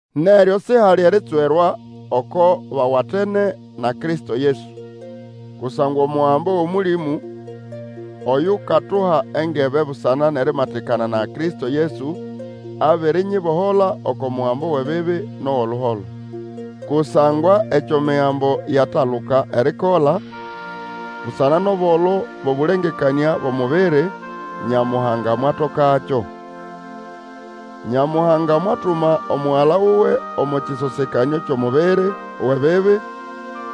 Neryo sihali eritswerwa oko bawatene na Kristo Yesu. Kusangwa omugambo wʼOmũlĩmũ oyukatuha engebe busana nʼerimatikana na Kristo Yesu, abirinyibohola oko mugambo wʼebibi nʼowʼoluholo. Kusangwa ekyo Migambo yataluka erikola, busana nʼobolo bwʼobũlengekanĩa bwʼomubiri, Nyamuhanga mwatokakyo. Nyamuhanga mwatuma Omugala wuwe omo kĩsosekanĩo kyʼomubiri wʼebibi,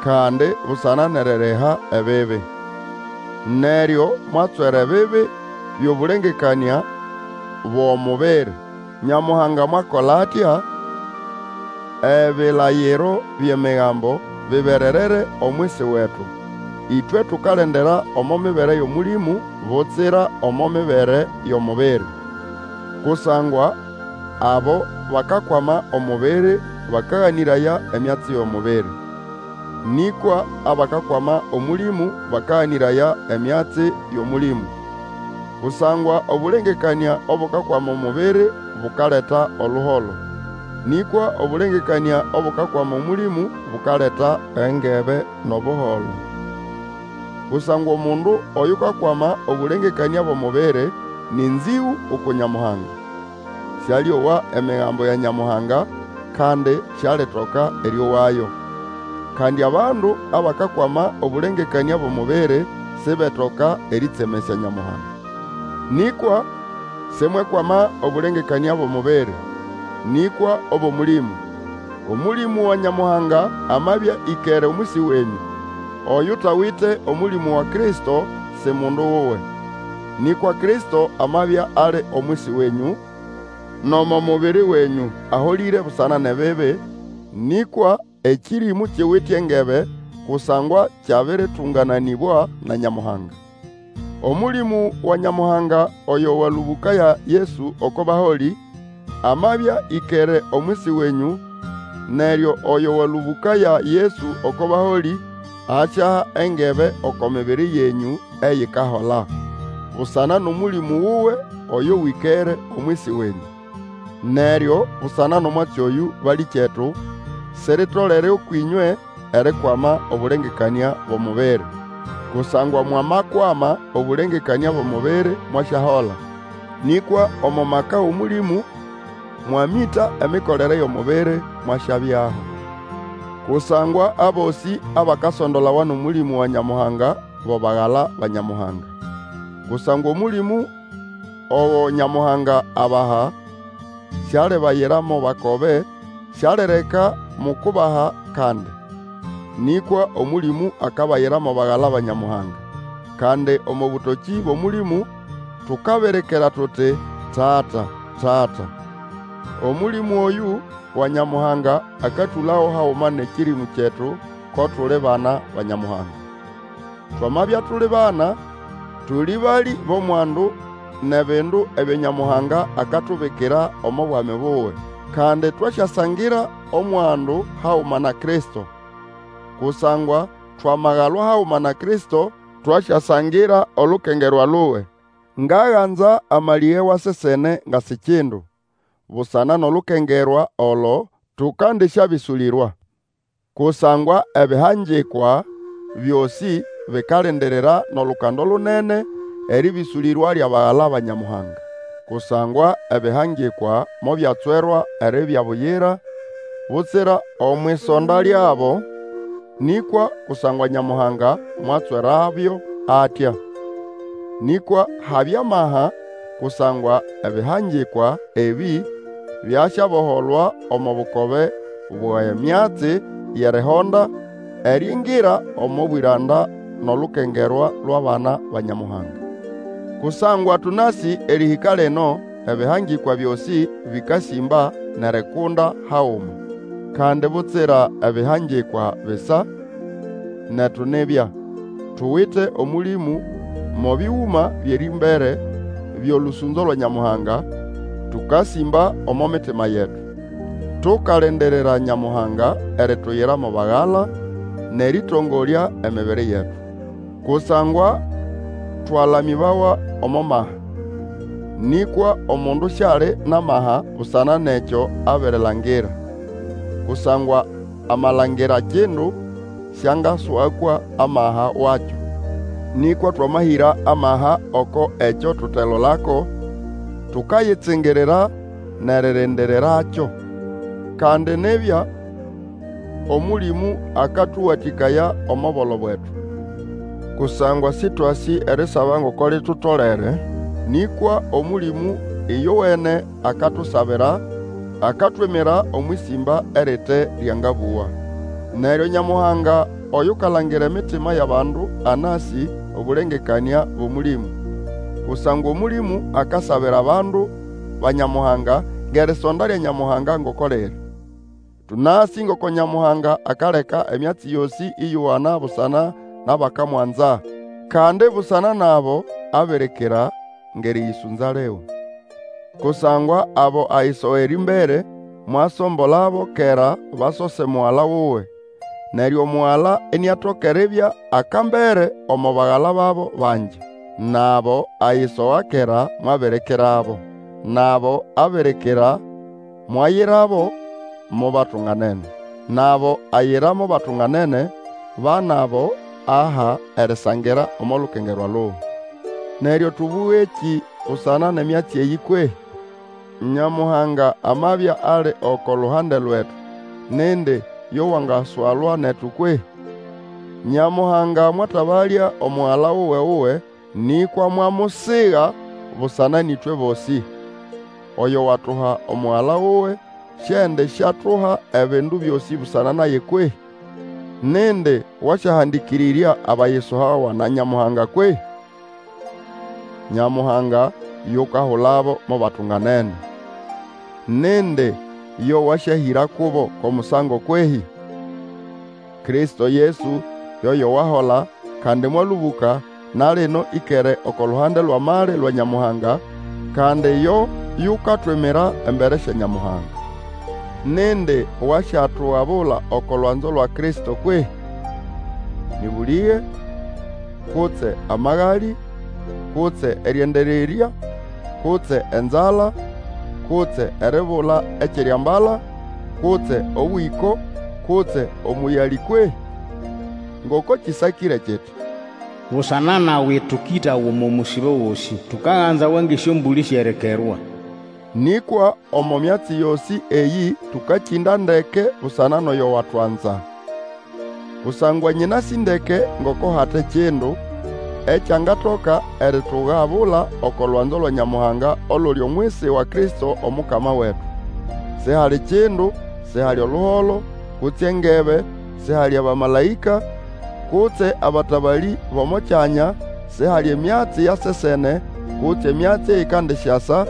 kandi busana nʼeririha ebibi. Neryo mwatswera ebibi byʼobũlengekanĩa bwʼomubiri. Nyamuhanga mwakola atya, ebilayiro byʼEmigambo bibererere omwisi wetu, ĩtwe tukalendera omo mibere yʼOmũlĩmũ, butsira omo mibere yʼomubiri. Kusangwa abo bakakwama omubiri bakaganĩraya emyatsi yʼomubiri. Nĩkwa abakakwama Omũlĩmũ bakaganĩraya emyatsi yʼOmũlĩmũ. Kusangwa obũlengekanĩa obukakwama omubiri bukaleta oluholo; nĩkwa obũlengekanĩa obukakwama Omũlĩmũ bukaleta engebe nʼobuholo. Kusangwa omundu oyukakwama obũlangekanĩa bwʼomubiri nĩ nzĩgũ uku Nyamuhanga. Sialĩowa Emigambo ya Nyamuhanga, kandi sialitoka erĩowayo. Kandi abandu abakakwama obũlengekanĩa bwʼomubiri sibetoka erĩtsemesya Nyamuhanga. Nĩkwa simwekwama obũlengekanĩa bwʼomubiri, nĩkwa obwʼOmũlimũ, Omũlĩmũ wa Nyamuhanga amabya ĩkere omwisi wenyũ. Oyutawite Omũlĩmũ wa Kristo si mundu wuwe. Nĩkwa Kristo amabya ali omwisi wenyũ, nomo mubiri wenyũ aholĩre busana nʼebibi, nĩkwa ekĩrĩmũ kiwite engebe kusangwa kyabĩrĩtũngananĩbwa na Nyamuhanga. Omũlĩmũ wa Nyamuhanga oyo walũbũkaya Yesu oko baholĩ, amabya ĩkere omwisi wenyũ, neryo oyo walũbũkaya Yesu oko baholĩ asyaha engebe oko mibiri yenyũ eyikahola, busana nʼOmũlĩmũ wuwe oyo wĩkere omwisi wenyũ. Neryo busana nʼomwatsi oyũ, balĩkyetu, siritolere ũkwʼĩnywe erikwama obũlengekanĩa bwʼomubiri. Kusangwa mwamakwama obũlengekanĩa bwʼomubiri mwasyahola; nĩkwa omo maka wʼOmũlĩmũ mwamĩta emikolere yʼomubiri, mwasyabyaho. Kusangwa abosĩ abakasondolawa nʼOmũlĩmũ wa Nyamuhanga bo bagala ba Nyamuhanga. Kusangwa Omũlĩmũ ogo Nyamuhanga abaha, sialibayira mo bakobe, Sialireka mukubaha kandi. Nĩkwa Omũlĩmũ akabayira mo bagala ba Nyamuhanga; kandi omo bũtokĩ bwʼOmũlĩmũ tukabirikira tuti, Tata! Tata! Omũlĩmũ oyũ wa Nyamuhanga akatũlago haguma nʼekĩrĩmũ kyetu ko tuli bana ba Nyamuhanga. Twamabya tuli bana, tuli balĩ bʼomwandu nʼebindu ebyo Nyamuhanga akatubikira omo bwami buwe. Kandi twasyasangira omwandu haguma na Kristo; kusangwa twamagalwa haguma na Kristo, twasyasangira olukengerwa luwe. Ngaganza amalĩge wa sesene nga si kindu busana nʼolukengerwa olo tũkandĩsyabĩsũlĩrwa. Kusangwa ebihangikwa byosĩ bikalindirira nʼolukando lunene erĩbĩsũlĩrwa lyʼabagala ba Nyamuhanga. Kusangwa ebihangikwa mobyatswerwa eribya buyira, butsira omwʼisonda lyabo, nĩkwa kusangwa Nyamuhanga mwatswerabyo atya. Nĩkwa habya amaha, kusangwa ebihangikwa ebĩ byasyaboholwa omo bukobe bwʼemyatsi yʼerihonda, eriingira omo bwĩranda nʼolukengerwa lwʼabana ba Nyamuhanga. Kusangwa tũnasĩ erĩhĩka lino ebihangikwa byosĩ bĩkasĩmba nʼerikunda haguma. Kandi butsira ebihangikwa bisa, netu nibya, tuwite Omũlĩmũ mo bĩgũma byʼerĩmbere byolũsũnzo lwa Nyamuhanga, tũkasĩmba omo mitima yetu, tukalindirira Nyamuhanga erituyira mo bagala, nʼerĩtongolya emibiri yetu. Kusangwa twalamĩbawa omo maha, nĩkwa omundu siali nʼamaha busana nʼekyo abirilangira, kusangwa amalangira kindu, siangaswakwa amaha wakyo. Nĩkwa twamahĩra amaha oko ekyo tutelolako, tukayitsingirira nʼeririndirirakyo. Kandi nibya Omũlĩmũ akatũwatĩkaya omo bolo bwetu. Kusangwa Sĩtwasĩ erisaba ngoko litutolere, nĩkwa Omũlĩmũ ĩyowene akatusabira, akatwimira omwʼĩsĩmba erite ryangabũwa. Neryo Nyamuhanga oyukalangira emitima yʼabandu anasĩ obũlengekanĩa bwʼOmũlĩmũ, kusangwa Omũlĩmũ akasabira abandu ba Nyamuhanga ngʼerisonda lya Nyamuhanga ngoko liri. Tũnasĩ ngoko Nyamuhanga akaleka emyatsi yosĩ ĩyowana busana nʼabakamwanza, kandi busana nʼabo abirikira ngʼerĩyĩsũnza liwe. Kusangwa abo ayisoga erĩmbere, mwasombolabo kera basose Mugala wuwe, neryo Omugala iniatoka eribya akambere omo bagala babo bangi. Nʼabo ayisoga kera mwabirikirabo. Nʼabo abirikira mwayirabo mo batunganene, nʼabo ayira mo batunganene, ba nʼabo ahabo erisangira omo lukengerwa luwe. Neryo tũbũgekĩ busana nʼemyatsi eyĩ kwehĩ? Nyamuhanga amabya ali oko luhande lwetu, nindi yo wangaswalwa netu kwehĩ? Nyamuhanga mwatabalya Omugala wuwe-wuwe, nĩkwa mwamusiga busana nʼĩtwe bosĩ! Oyo watuha Omugala wuwe, siendisyatuha ebindu byosĩ busana naye kwehĩ? Nindi wasyahandĩkĩrĩrya abayisogawa na Nyamuhanga kwehĩ? Nyamuhanga yukahulabo mo batunganene. Nindi yo Wasyahĩra kubo kwʼomusango kwehĩ? Kristo Yesu yoyo wahola, kandi mwalũbũka, na lino ĩkere oko luhande lwʼamali lwa Nyamuhanga, kandi yo yukatwimira embere sya Nyamuhanga. Nindi wasyatugabula oko lwanzo lwa Kristo kwehĩ? Nĩ bũlĩge, kutse amagaliĩ, kutse erĩendererya, kutse enzala, kutse eribula ekyʼeriambala, kutse obwĩko, kutse omũyalĩ kwehĩ? Ngoko kĩsakĩre kiti, Busana nawe tũkĩtawa omo musibo gosĩ. Tukaganzawa ngʼesyombũlĩ syʼerikerwa. Nĩkwa omo myatsi yosĩ eyĩ tũkakĩnda ndeke busana nʼoyo watwanza! Kusangwa nyĩnasĩ ndeke ngoko hate kindu ekyangatoka eritugabula oko lwanzo lwa Nyamuhanga oluli omwisi wa Kristo Omukama wetu. Sihali kindu, sihali oluholo, kutse engebe, sihali abamalaĩka, kutse abatabalĩ bʼomo kyanya, sihali emyatsi ya sesene, kutse emyatsi eyikandisyasa,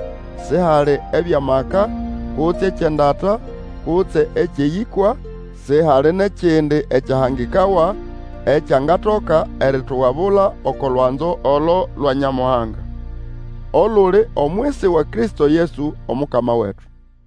sihali ebyʼamaka, kutse ekyʼendata, kutse ekyʼeyĩkwa, sihali nʼekindi ekyahangikawa, ekyangatoka eritugabula oko lwanzo olo lwa Nyamuhanga, oluli omwisi wa Kristo Yesu Omukama wetu.